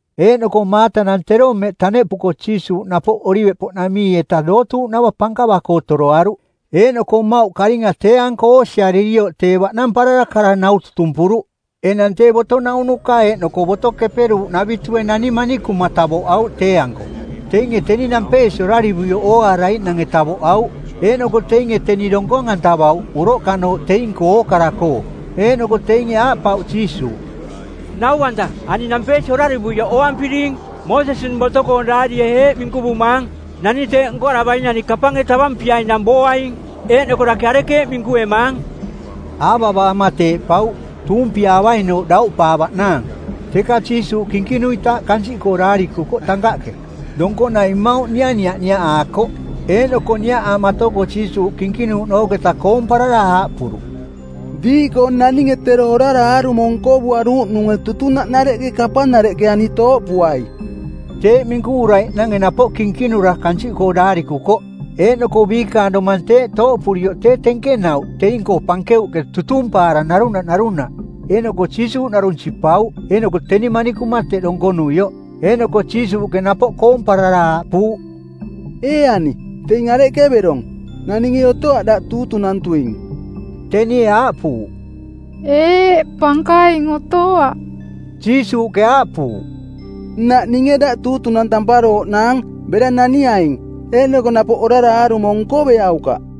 Eeꞌnoko maatanang tero mmeꞌ taneꞌpuko Jiisuuꞌ napoꞌ Oliveꞌpoꞌnamii-eta dootuuꞌnava pankava-koo toroaruꞌ. Eeꞌnoko mmauꞌ karinga tee-anko oosiaririoꞌ tee baꞌnamparara kara nau tutumpuruꞌ. Enang tee boto naunuka eeꞌnoko Boto Keperuuꞌnavitue nani manikuma tavoꞌauꞌ tee-anko. Teinge teni nampeesi orarivuioꞌ ooaaraiꞌnange tavoꞌauꞌ. Eeꞌnoko teinge teni donkong-antavauꞌ uroꞌkanooꞌ teing-koo ookara-koo. Eeꞌnoko teinge aaꞌpauꞌ Jiisuuꞌ, “Nau-anta, ani nampeesi orarivuioꞌ ooampiring. Moosesi-nung Boto-koong daarie eeꞌ minkuvumaang, ‘Nani teeꞌ nkoaravainani kapange tavampiainang booaing.’ Eeꞌnoko dake arekeeꞌ minkuemaang?” Aavavaama teeꞌpauꞌ, tuumpiaavainooꞌ dauꞌpaavaꞌnaang, teka Jiisuuꞌ kinkinuitaaꞌ kansiꞌkoo daarikukoꞌ tankaꞌke. Donkonai mmauꞌ nianiaꞌ niaꞌaakoꞌ, eeꞌnoko niaꞌaamatoko Jiisuuꞌ kinkinuuꞌnooꞌketa koomparara aaꞌpuruꞌ, “Diiꞌkoong naninge tero orara aarumo nkovuaruuꞌnunge tutunaꞌnareꞌke kapanareꞌke ani tooꞌpuai.” Teeꞌ minkuvuraiꞌnange napoꞌ kinkinura kansiꞌkoo daarikukoꞌ. Eeꞌnoko biikang domang teeꞌ tooꞌpurioꞌ tee tenkenauꞌ teing-koo pankeuꞌke tutumpaara narunaꞌ narunaꞌ. Eeꞌnoko Jiisuuꞌ narung sipauꞌ, eeꞌnoko teni manikuma teꞌ donkonuioꞌ. Eeꞌnoko Jiisuuꞌke napoꞌ koomparara aaꞌpuuꞌ, “Ee ani, teing areꞌke berong? Naning ee otoaꞌ daꞌ tuutunantuing?” Tenie aaꞌpuuꞌ, “Eeꞌ, pankaing, otoaꞌ.” Jiisuuꞌke aaꞌpuuꞌ, “Nnaꞌ ninge daꞌ tuutunantamparooꞌnaang. Bera naniaing. Eeꞌnoko napoꞌ orara aarumo nkoveaukaꞌ.”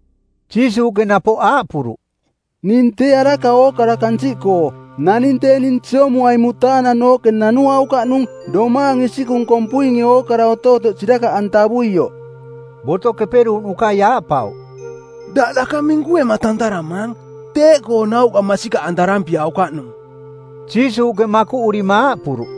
Jiisuuꞌke napoꞌ aaꞌpuruꞌ, “Ning tee araka ookara kansiꞌkoo. Naning tee ning siomuaing mutaananooꞌke nanuaukaꞌnung, domaang isikung kompuinge ookara otootoꞌ sirakaꞌantavuioꞌ.” Boto Keperuuꞌnukai aaꞌpauꞌ, “Daꞌ daka minkuema tantaramaang, teeꞌkoo nauꞌka masikaꞌantarampiaukaꞌnung.” Jiisuuꞌke makuꞌurima aaꞌpuruꞌ,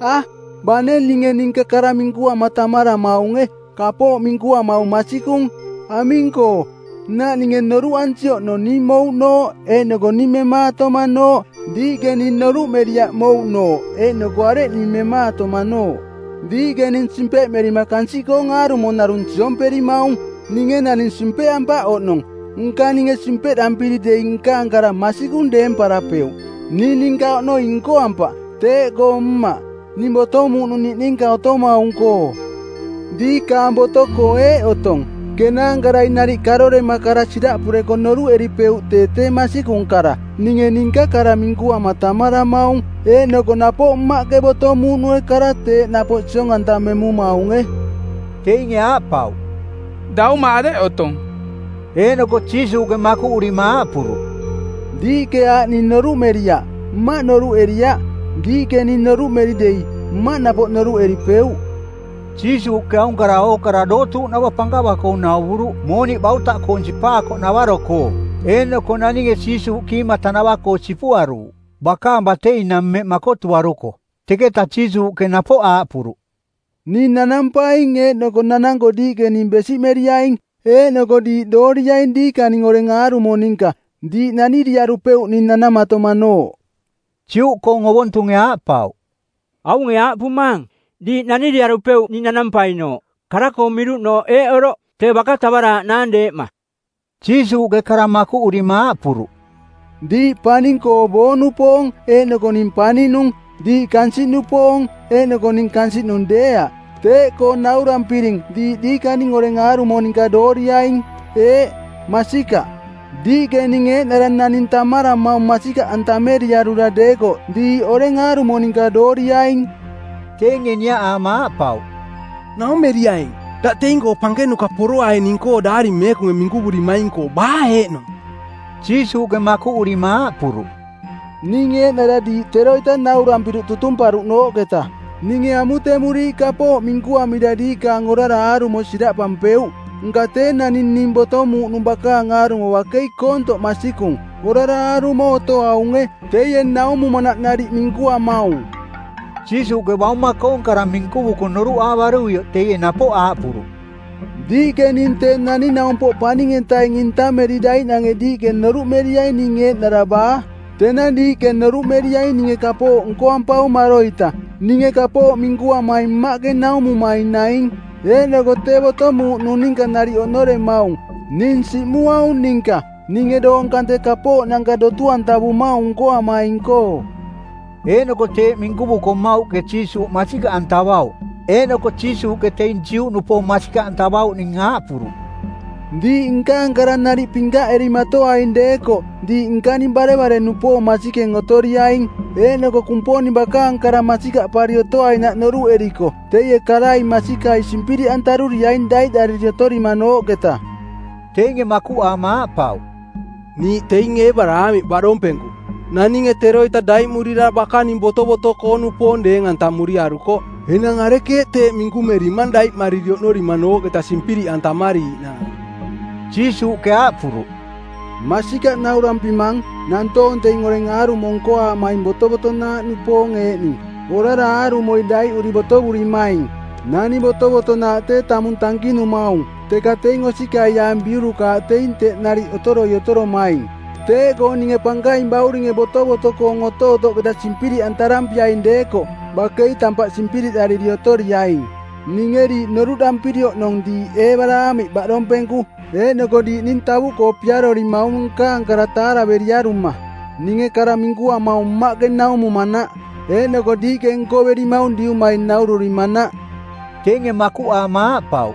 “A, bane ninge ninka kara minkuama tammaramaunge, kapooꞌ minkuamaung masikung. Aming-koo, nnaꞌ ninge noruꞌansi oꞌnong ning mouꞌnooꞌ eeꞌnoko ning memaatomanooꞌ. Diiꞌke ning noruꞌmeriaꞌ mouꞌnooꞌ eeꞌnoko areꞌ ning memaatomanooꞌ. Diiꞌke ning simpeꞌmerima kansiꞌkoong aarumo narung siomperimaung. Ninge naning simpeꞌampaꞌ oꞌnong. Nka ninge simpeꞌdampiri dei nkaang kara masikung deemparapeuꞌ. Ning ninka oꞌnoi nkoampaꞌ, teeꞌkoo Mmaꞌ, ning botomuuꞌnung niꞌninka otomaung-koo. Diikaang boto-koo eeꞌ otong, ‘Kenaankarai nariꞌ karorema kara siraꞌpureko noruꞌeripeuꞌ tee tee masikung kara.’ Ninge ninka kara minkuama tammaramaung eeꞌnoko napoꞌ Mmaꞌke botomuuꞌnunge kara teeꞌ napoꞌ siong-antamemumaunge.” Teinge aaꞌpauꞌ, “Dauma areꞌ otong?” Eeꞌnoko Jiisuuꞌke makuꞌurima aaꞌpuruꞌ, “Diiꞌke aaꞌ ning noruꞌmeriaꞌ, Mmaꞌ noruꞌeriaꞌ. Diiꞌke ning noruꞌmeri dei, Mmaꞌ napoꞌ noruꞌeripeuꞌ.” Jiisuuꞌke aung kara ookara dootuuꞌnava pankava-koo nauvuruꞌ mooniꞌ bautaꞌkoong sipaakoꞌnavaro-koo. Eeꞌnoko naninge Jiisuuꞌ kiimata-nava-koo sipuaruuꞌ bakaang bateinang mmeꞌ makotuaruko. Teketa Jiisuuꞌke napoꞌ aaꞌpuruꞌ, “Ning nanampaing eeꞌnoko nananko diiꞌke ning besiꞌmeriaing, eeꞌnoko diiꞌ dooriaing diikaning oreng aarumo ninka. Diiꞌ naniriarupeuꞌ ning nanamatomanooꞌ.” Juꞌkoong ovontunge aaꞌpauꞌ, “Aunge aaꞌpumaang, ‘Diiꞌ naniriarupeuꞌ ning nanampainooꞌ.’ Kara-koong miruꞌnooꞌ eeꞌ oroꞌ: tee baka tavaraaꞌnaang deeꞌma.” Jiisuuꞌke kara makuꞌurima aaꞌpuruꞌ, “Diiꞌ paning-koo boong-nupoong eeꞌnoko ning paning-nung. Diiꞌ kansiꞌnupoong eeꞌnoko ning kansiꞌnung deeaꞌ. Teeꞌkoo naurampiring diiꞌ diikaning oreng aarumo ninka dooriaing. Eeꞌ, masikaꞌ, diiꞌke ning eeꞌnara naning tammaramaung masikaꞌantameriarura deekoꞌ diiꞌ oreng aarumo ninka dooriaing.” Teinge niaꞌaama aaꞌpauꞌ, “Naumeriaing, daꞌ teing-koo pankenuka poroaining-koo Daari Meekunge minkuvurimaing-koo baa eeꞌnung?” Jiisuuꞌke makuꞌurima aaꞌpuruꞌ, “Ning eeꞌnara diiꞌ teroita naurampiruꞌ tutumparuꞌnooꞌketa. Ninge amutemuriiꞌ kapooꞌ minkuamira diikaang orara aarumo siraꞌpampeuꞌ. Nka tee naning ning botomuuꞌnung bakaang aarumo bakei koontoꞌ masikung, orara aarumo otoaunge. Teie naumumanaꞌ nariꞌ minkuamaung.” Jiisuuꞌke Bauma-koong kara minkuvuko noruꞌaavaruioꞌ teie napoꞌ aaꞌpuruꞌ, “Diiꞌke ning Tee Naning-naumpoꞌ Paning-etaing intameriraiꞌnange diiꞌke noruꞌmeriaing ning eeꞌnara baa. Tenang diiꞌke noruꞌmeriaing ninge kapooꞌ nkoampaung maroita, ninge kapooꞌ minkuamaing Mmaꞌke naumumaing naing. Eeꞌnoko tee botomuuꞌnung niꞌninka nariꞌ oꞌnoremaung. Ning siꞌmuaung ninka, ninge doong kante kapooꞌnanka dotu-antavumaung nkoamaing-koo.” Eeꞌnoko teeꞌ minkuvuko mmauꞌke Jiisuuꞌ masikaꞌantavauꞌ. Eeꞌnoko Jiisuuꞌke teing Juꞌnupoong masikaꞌantavauꞌning aaꞌpuruꞌ, “Diiꞌ nkaang kara nariꞌ pinkaꞌerimatoaing deekoꞌ diiꞌ nkaning barevare-nupoong masikeng otoriaing. Eeꞌnoko Kumponing bakaang kara masikaꞌpari otoinaꞌ noruꞌeriko teie karai masikai simpiriꞌantaruriaing daiꞌdariri otorimanooꞌketa.” Teinge makuꞌaama aaꞌpauꞌ, “Niiꞌ teing Eebaraamiꞌ baꞌdompenku. Naninge teroita daiꞌmurira bakaning botovoto-koo-nupoong deeng-antamuriarukoꞌ. Enang arekeeꞌ teeꞌ minkumerimang daiꞌmariri oꞌnorimanooꞌketa simpiriꞌantamariiꞌnaang?” Jiisuuꞌke aaꞌpuruꞌ, “Masikaꞌ naurampimang, nantoong teing oreng aarumo nkoaamaing botovotonaaꞌnupoong eeꞌning, orara aarumoi daiꞌuri botovurimaing. Naning botovotonaaꞌ tee tamung tankinumaung, teka teing osikaiaang biurukaaꞌ teing teꞌ nariꞌ otoroi otoromaing. Teeꞌkoo ninge Pankaing Bauringe botovoto-koong otootoꞌketa simpiriꞌantarampiaing deekoꞌ, bakei tampaꞌ simpiriꞌdariri otoriaing! Ninge diiꞌ noruꞌdampiri oꞌnong diiꞌ Eebaraamiꞌ baꞌdompenku, eeꞌnoko diiꞌ ning tavuꞌkoo piarorimaung nkaang kara taaraveriaruma. Ninge kara minkuamaung Mmaꞌke naumumanaꞌ, eeꞌnoko diiꞌke nkoverimaung diumai naururimanaꞌ.” Teinge makuꞌaama aaꞌpauꞌ,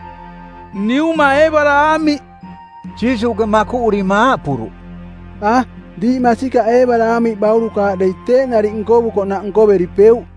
“Niuma Eebaraamiꞌ.” Jiisuuꞌke makuꞌurima aaꞌpuruꞌ, “A, diiꞌ masikaꞌ Eebaraamiꞌ baurukaaꞌ dei teeꞌ nariꞌ nkovukoꞌnaꞌ nkoveripeuꞌ.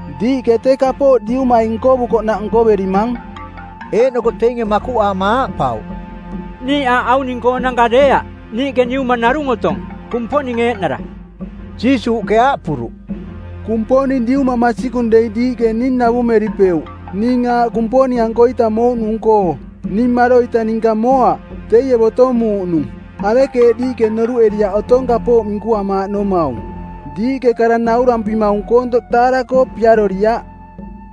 Diiꞌke tee kapooꞌ diumai nkovukoꞌnaꞌ nkoverimang.” Eeꞌnoko teinge makuꞌaama aaꞌpauꞌ, “Niiꞌ aaꞌ auning-koonanka deeaꞌ. Niiꞌke Niuma narung otong. Kumponing eeꞌnara.” Jiisuuꞌke aaꞌpuruꞌ, “Kumponing diuma masikung dei diiꞌke ning navumeripeuꞌ, ning aaꞌ Kumponing-ankoita mouꞌnung-koo. Ning maroita ninka moaꞌ, teie botomuuꞌnung. Arekeeꞌ diiꞌke noruꞌeriaꞌ otong kapooꞌ minkuamaaꞌnomaung? Diiꞌke kara naurampimaung koontoꞌ taara-koo piaroriaꞌ.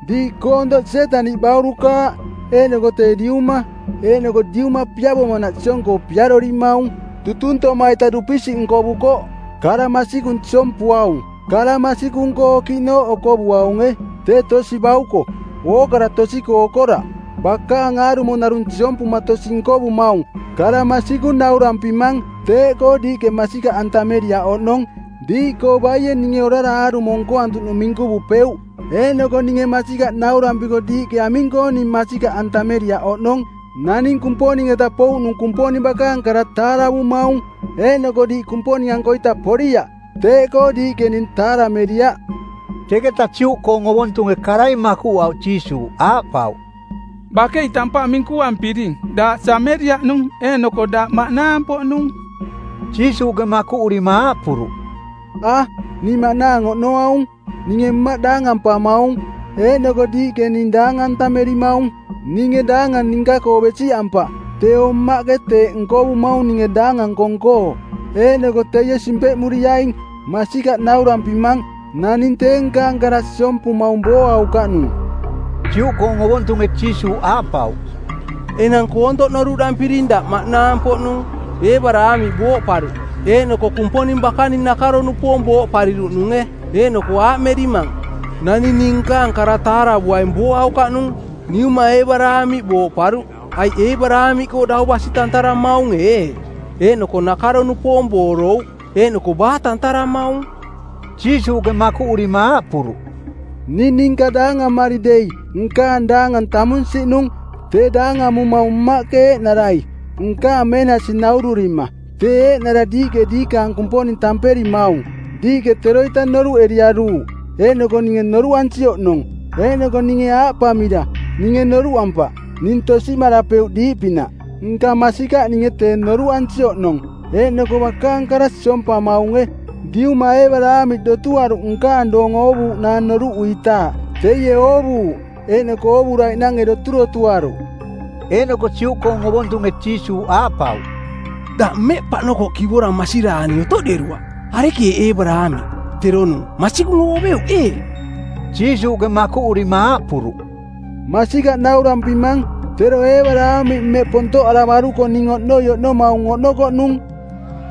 Diiꞌ koontoꞌ Sietaniꞌ baurukaaꞌ eeꞌnoko tee diuma, eeꞌnoko diuma piavomanaꞌ siong-koo piarorimaung. Tutuntoma-ita dupisiꞌ nkovukoꞌ. Kara masikung siompuaung. Kara masikung-koo okiꞌnooꞌ okovuaunge. Tee tosi-bauko, ookara tosi-koo okoraꞌ. Bakaang aarumo narung siompuma tosi nkovumaung. Kara masikung naurampimang, teeꞌkoo diiꞌke masikaꞌantameriaꞌ oꞌnong. Diiꞌkoo baie ninge orara aarumo nkoantuꞌnung minkuvupeuꞌ? Eeꞌnoko ninge masikaꞌ naurampiko diiꞌke aming-koo ning masikaꞌantameriaꞌ oꞌnong? Naning Kumponing-eta pouꞌnung Kumponing bakaang kara taaravumaung, eeꞌnoko diiꞌ Kumponing-ankoita poriaꞌ. Teeꞌkoo diiꞌke ning taarameriaꞌ.” Teketa Juꞌkoong ovontunge karai makuꞌauꞌ Jiisuuꞌ. Aaꞌpauꞌ, “Bakei tampaꞌ minkuampiring, daꞌ Sameriaꞌnung, eeꞌnoko daꞌ maꞌnaang-poꞌnung.” Jiisuuꞌke makuꞌurima aaꞌpuruꞌ, “A, ning maꞌnaang oꞌnoaung. Ninge Mmaꞌ daangampamaung eeꞌnoko diiꞌke ning daang-antamerimaung. Ninge daangang ninka-koo besiꞌampaꞌ, teeo Mmaꞌke teeꞌ nkovumaung ninge daangang kong-koo, eeꞌnoko teie simpeꞌmuriaing. Masikaꞌ naurampimang, naning tee nkaang kara siompumaung booaukaꞌnung.” Juꞌkoong ovontunge Jiisuuꞌ aaꞌpauꞌ, “Enang koontoꞌ noruꞌdampiring daꞌ maꞌnaang-poꞌnung. Eebaraamiꞌ booꞌparuꞌ, eeꞌnoko Kumponing bakaning nakaro-nupoong booꞌpariruꞌnunge, eeꞌnoko aaꞌmerimang, ‘Naning ning nkaang kara taaravuaing booaukaꞌnung.’ Niuma Eebaraamiꞌ booꞌparuꞌ, aiꞌ Eebaraamiꞌkoo dau basi tantaramaunge ee? Eeꞌnoko nakaro-nupoong boorouꞌ. Eeꞌnoko baa tantaramaung?” Jiisuuꞌke makuꞌurima aaꞌpuruꞌ, “Ning ninka daangamari dei, nkaang daangang tamunsiꞌnung. Tee daangamumaung Mmaꞌke eeꞌnarai, nkaang meenasi naururima. Tee eeꞌnara diiꞌke diikaang Kumponing tamperimaung. Diiꞌke teroita noruꞌeriaruuꞌ, eeꞌnoko ninge noruꞌansi oꞌnong. Eeꞌnoko ninge aaꞌpamira, ‘Ninge noruꞌampaꞌ,’ ning tosimarapeuꞌ diiꞌpinaꞌ. Nka masikaꞌ ninge tee noruꞌansi oꞌnong, eeꞌnoko bakaang kara siompamaunge. Diuma Eebaraamiꞌ dotuaruꞌ nkaang doong oovuuꞌnaang noruꞌuitaaꞌ. Teie oovuuꞌ eeꞌnoko oovuraiꞌnange doturotuaruꞌ.” Eeꞌnoko Juꞌkoong ovontunge Jiisuuꞌ aaꞌpauꞌ. “Daꞌ mmeꞌ paꞌnokoꞌ kivora masiraani otoꞌderuaꞌ, arekeeꞌ Eebaraamiꞌ, teronung masikung ooveuꞌ ee?” Jiisuuꞌke makuꞌurima aaꞌpuruꞌ, “Masikaꞌ naurampimang, tero Eebaraamiꞌ mmeꞌ pontoꞌaravaruko ning oꞌnoi oꞌnomaung oꞌnokoꞌnung.”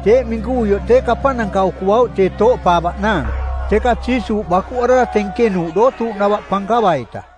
Teeꞌ minkuvuioꞌ tee kapananka ukuauꞌ tee tooꞌpaavaꞌnaang, teka Jiisuuꞌ bakuꞌarara tenkenuuꞌ dootuuꞌnava pankava-ita.